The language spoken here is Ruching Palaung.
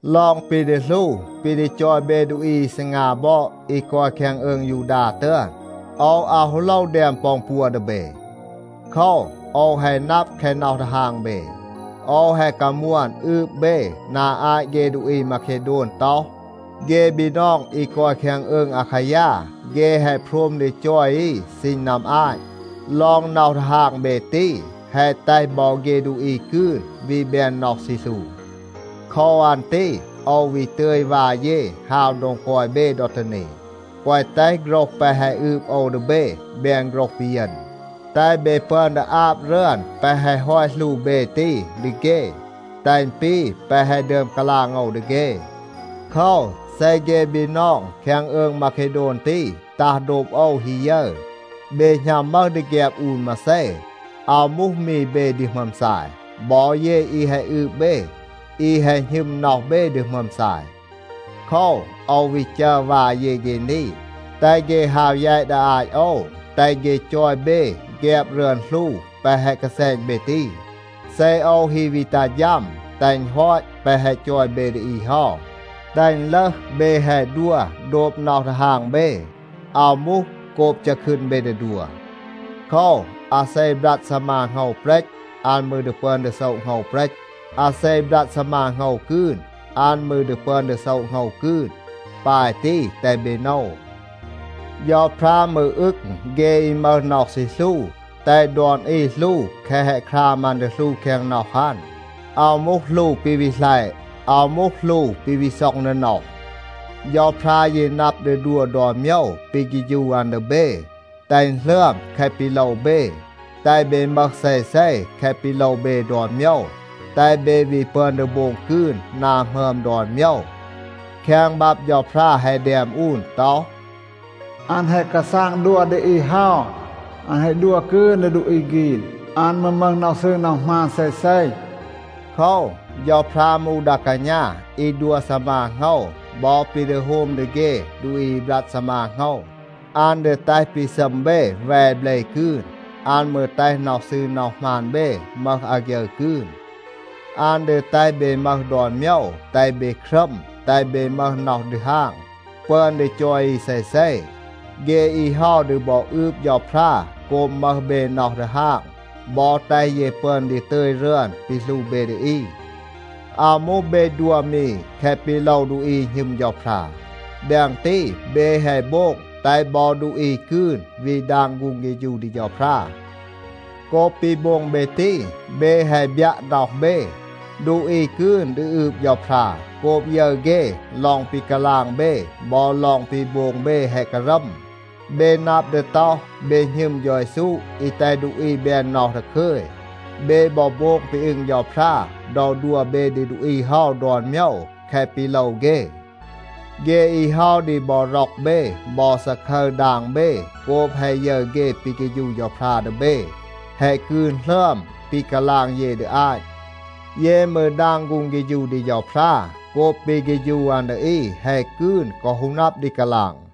ลอง ปี ดี หลู ปี ดี จอย เบ ดูอี อี ซีงา บอด อี กอย แคง อืง ยูดา ตึอน, โอว อาว ฮู โลว แดม ปอ อึณ ปัว ดี เบ. โคว, โอว แฮะ นับ แคะ น็อห ดีฮาง เบ. โอว แฮะ กามวน อืบ เบ นา อาต เฆ ดูอี มาเคโดน ต็อห, “เฆ บีนอง อี กอย แคง อืง อาคายา, เฆ แฮะ โพรม ดี จอย อี ซีณ นัม อาต.” ลอง น็อห ดีฮาง เบ ตี, แฮะ แตห บอ เฆ ดูอี กืน วี แบน น็อห ซี หลู. โคว อัน ตี โอว วี ตึย วา เย ฮาว โดง กอย เบ ดอ ตี นี, แกวะ แตห โฆรห แปะ แฮะ อืบ โอว ดี เบ แบน โฆรห ปีเยณ. แตห เบ ปึอน ดี อาบ รึอน แปะ แฮะ ฮอต หลู เบ ตี ดี เฆ, แตห อึณ ปี แปะ แฮะ ดึอม กาลาง โอว ดี เฆ. โคว, เซ เฆ บีนอง แคง อืง มาเคโดน ตี ตัห โดบ โอว ฮี ยึร, เบ หณัม มึห ดี แฆบ อูน มาเซ, อาว มูห มี เบ ดี หมึอม ซาย. บอ เย อี แฮะ อืบ เบ, อี แฮะ หณึม น็อห เบ ดี หมึอม ซาย. โคว, โอว วี จัร วา เย เฆ นี, แตห เฆ ฮาว แยต ดี อาต โอว, แตห เฆ จอย เบ แฆบ รึอน หลู แปะ แฮะ กาแซณ เบ ตี. เซ โอว ฮี วี ตัห ฌัม, แตห อึณ ฮอต แปะ แฮะ จอย เบ ดี อี เฮา, แตห อึณ ลึห เบ แฮะ ดัว โดบ น็อห ดีฮาง เบ, อาว มูห โกบ จัะคืน เบ ดี ดัว. โคว, อาเซ บรัด ซีมา โหงว เปรต, อัน มืร ดี ปึอน ดี โซะ โหงว เปรต. อาเซ บรัด ซีมา โหงว กืน, อัน มืร ดี ปึอน ดี โซะ โหงว กืน. ปาย ตี, แตห เบ โนว. เฌาพรา มืร อึง เฆ อี มึห น็อห ซี หลู. แตห ดอน อี หลู แคะ แฮะ คราม อัน ดี หลู แคง น็อห อัน. อาว มูห หลู ปี วี หลัยะ. อาว มูห หลู ปี วี ซ็อง ดี น็อห. เฌาพรา ยี นับ ดี ดัว ดอน โมยว ปี เฆฌู อัน ดี เบ, แตห อึณ หลึอม แคะ ปี โลว เบ, แตห เบ มึห เซเซ แคะ ปี โลว เบ ดอน โมยว, แตห เบ วี ปึอน ดี โบง กืน นา หมึอม ดอน โมยว. แคง บับ เฌาพรา แฮะ แดม อูน ต็อห, “อัน แฮะ กาซาง ดัว ดี อี เฮา. อัน แฮะ ดัว กืน ดี ดูอี ฆีน, อัน มืร มึห น็อห ซืร น็อห หมาน เซเซ.” โคว, เฌาพรา มูห ดา กาณา อี ดัว ซีมา โหงว บอ ปี ดี โฮม ดี เฆ ดูอี อี บรัด ซีมา โหงว. อัน ดี แตห ปี ซัม เบ แว เบล กืน. อัน มืร แตห น็อห ซืร น็อห หมาน เบ มึห อาฆยึร กืน. อัน ดี แตห เบ มึห ดอน โมยว, แตห เบ ครัม, แตห เบ มึห น็อห ดีฮาง, ปึอน ดี จอย อี เซเซ. เฆ อี เฮา ดี บอ อืบ เฌาพรา โกบ มึห เบ น็อห ดีฮาง บอ แตห เย ปึอน ดี ตึย รึอน ปี หลู เบ ดี อี. อาว มูห เบ ดัว มี แคะ ปี โลว ดูอี อี หณึม เฌาพรา. แดง ตี, เบ แฮะ โบง แตห บอ ดูอี กืน วี ดาง ฆูง เฆฌู ดี เฌาพรา. โกบ ปี โบง เบ ตี, เบ แฮะ บยัะ น็อห เบ. ดูอี กืน ดี อืบ เฌาพรา โกบ ยึร เฆ ลอง ปี กาลาง เบ บอ ลอง ปี โบง เบ แฮะ การัม. เบ นับ ดี ต็อห, เบ หณึม เฌา เยซู อี แตห ดูอี แบน น็อห ดาคึย. เบ บอ โบง ปี อึง เฌาพรา ดอ ดัว เบ ดี ดูอี เฮา ดอน โมยว แคะ ปี โลว เฆ. เฆ อี เฮา ดี บอ ร็อก เบ บอ ซาคึร ดาง เบ โกบ แฮะ ยึร เฆ ปี เฆฌู เฌาพรา ดี เบ แฮะ กืน หลึอม ปี กาลาง เย ดี อาต. เย มืร ดาง ฆูง เฆฌู ดี เฌาพรา โกบ ปี เฆฌู อัน ดี อี แฮะ กืน กอ ฮู นับ ดี กาลาง.